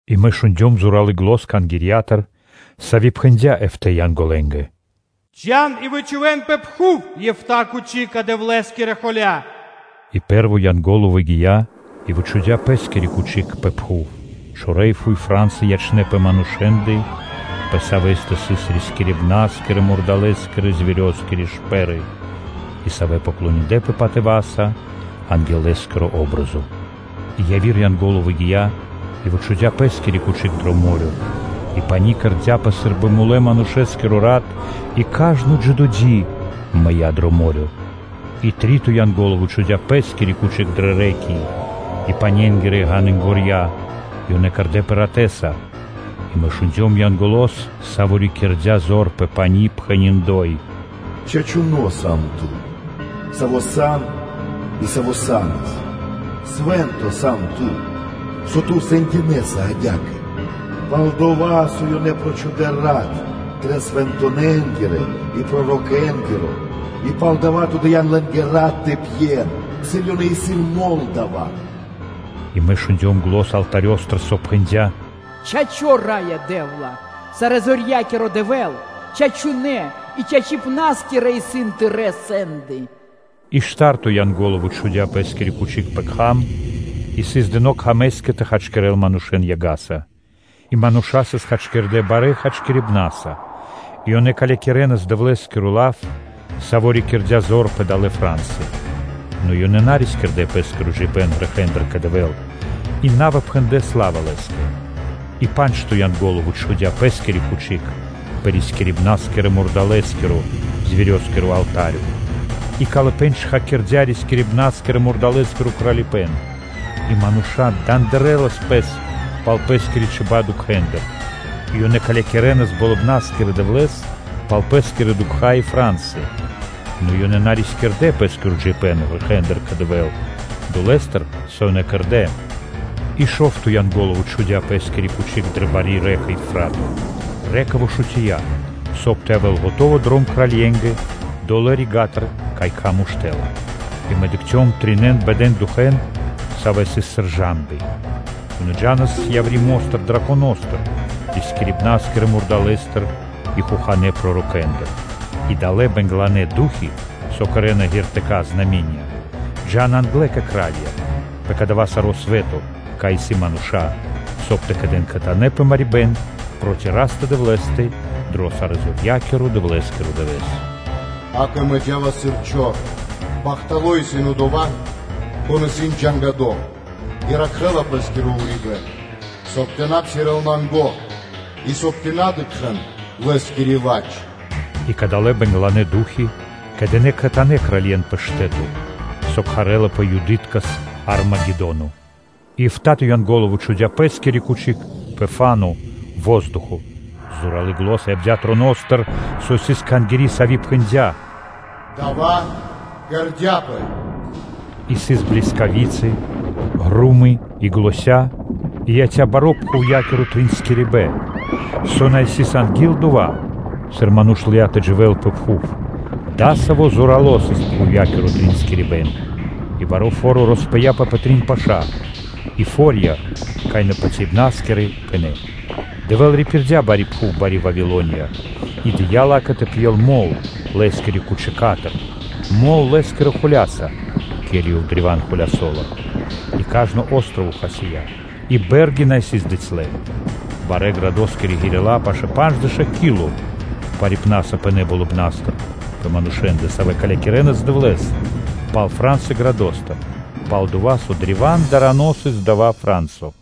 И мэ шундём зоралы́ зан Кхангирья́тыр, сави́ пхэндя́ эфта́ (эфтэ) Янголэнгэ: “Джа́н и вычхувэн пэ пхув эфта́ тахта́я (чашы) Дэвлэ́скирэ холя́са.” И пэ́рво Янго́ло выгия́ и вычхудя́ пэ́скиро тахта́й пэ пхув: чорэ́ и фуй фра́нсы (ра́ны) ячнэ́ пэ манушэ́ндэ, пэ савэ́ндэ сыс рискирибна́скирэ-мурдалэскирэ (зверёскирэ) шпэры, и, савэ́ поклониндлэпэ патыва́са анги́л лэ́скири патри́н (о́бразо). И яви́р Янго́ло выгия́ и вычхудя́ пэ́скиро тахта́й дро мо́рё (дэрья́в): и пани́ кэрдя́пэ сы́рбы мулэ́-манушэ́скиро рат и кажно джидо́ ди (создыибэн) мыя́ дро мо́рё (дэрья́в). И три́то Янго́ло вычхудя́ пэ́скиро тахта́й дрэ рэ́ки (лэня́) и паненгирэ ґанынгорья: и ёнэ кэрдэ́пэ ратэ́са. И мэ шундём Янголо́с, саво́ рикирдя зор пэ пани́, пхэни́: “Чачуно́ сан Ту, Саво́ сан и Саво́ са́нас, Свэ́нто сан Ту, со Ту сэндякирэса адя́кэ”, Пал-дова́ со ёнэ прочхудэ рат Трэ свэнтонэнгирэ и пророкэнгиро, И палдава́ Ту дыя́н лэ́нгэ рат тэ пьен, сыр ёнэ исын мол дава́. И мэ шундём зан алтарёстыр, со пхэндя́: “Чачо́, Раё Дэ́вла, Сарэзорья́киро Дэвэ́л, чачунэ́ и чачипнаскирэ исын Тырэ́ сэнды!” И шта́рто Янго́ло вычхудя́ пэ́скиро тахта́й пэ кхам: и сыс дыно́ кхамэскэ тэ хачкирэл манушэ́н яга́са. И мануша́ сыс хачкирдэ́ барэ́ хачкирибнаса и ёнэ калякирэнас Дэвлэ́скиро лав, Саво́ рикирдя зор пэ далэ́ фра́нсы. Нэ ёнэ на рискирдэ́ пэ́скиро джиибэ́н грэхэ́ндыр кэ Дэвэ́л и на выпхэндлэ сла́ва Лэ́скэ. И па́нджто Янго́ло вычхудя́ пэ́скиро тахта́й пэ рискирибна́скирэ-мурдалэскиро (зверёскиро) алта́рё: и калыпэ́н чхакирдя рискирибна́скирэ-мурдалэскиро кралипэ́н и мануша́ дандырэнас пэс пал пэ́скирэ чиба́ (чибья́) дукхэндыр; и ёнэ калякирэнас Болыбна́скирэ Дэвлэ́с пал пэ́скирэ дукха́ и фра́нсы. Нэ ёнэ на рискирдэ́ пэ́скиро джиибэ́н грэхэ́ндыр кэ Дэвэ́л долэ́стыр, со ёнэ кэрдэ́. И шо́вто Янго́ло вычхудя́ пэ́скиро тахта́й дрэ бари рэка (лэнь) Евфрато: рэка (лэнь) вышутия, соб (кай) тэ явэ́л скэдыно́ дром кральенгэ долэ́ рига́тыр, кай кхам уштэ́ла. И мэ дыкхцём трин бэда ду́хи, савэ́ сыс сыр цапня (жамбы). Ёнэ джа́нас яври́ мо́стыр драконостыр, рискирибна́скирэ мурдалэстыр и хоханэ́ пророкостыр. И далэ́ бэнгланэ ду́хи, со кэрэ́на ґертыка́ (знаме́нии), джа́на англэ кэ кра́лья пэ дава́ саро́ свэ́то, кай исын мануша́, соб (кай) тэ кэдэнпэ кхэтанэ́ марибна́са пэ Дэвлэ́стэ Сарэзорьякирэстэ пэ баро́ Дывэ́с. “Акэ, мэ джа́ва сыр чор. Бахтало́ исын одова́, кон исын насуто и ракхэ́ла пэ́скиро урибэ́н, соб (кай) тэ на псирэ́л нанго и, соб (кай) тэ на дыкхэ́л лэ́скири ладж!” И кадалэ́ бэнгланэ ду́хи кэдынэ кхэтанэ́ кралье́н пэ штэ́то, со кхарэ́лапэ Юдыткэс “Армагедоно.” И эфта́то Янго́ло вычхудя́ пэ́скиро тахта́й пэ фа́но (воздухо): зоралы́ зан явдя́ троностыр, саво́ сыс дрэ Кхангири́, сави́ пхэндя́: “Дава́ кэрдя́пэ.” И сыс блискави́цы, гро́мы и заня́, и яця́ баро́ пхувья́киро тринскирибэн, со на сыс анги́л дова́, сыр ману́ш лыя́ тэ дживэ́л пэ пхув-дасаво зорало́ сыс пхувья́киро тринскирибэн. И баро́ фо́ро роспыяпэ пэ трин паша́, и фо́рья, кай напатяибнаскирэ, пынэ́. Дэвэ́л рипирдя бари пхув Бари Вавилония и дыя́ ла́кэ тэ пьел мол Лэ́скирэ тахтастыр – мол (вино) Лэ́скирэ холя́са, ке́ли Ёв древа́н холясо́ла. И кажно о́строво (джип) хасия́, и бэ́рги на сыс дыцьлэ. Барэ́-градо́скирэ ґирила́, савэ́ сыс пашэ́ пандждэша́ кило пхарипнаса, пынэ́ болыбна́стыр пэ манушэ́ндэ, савэ́ калякирэнас Дэвлэ́с пал фра́нсы градостыр, пал-дова́ со древа́н дарано сыс дава́ фра́нсо.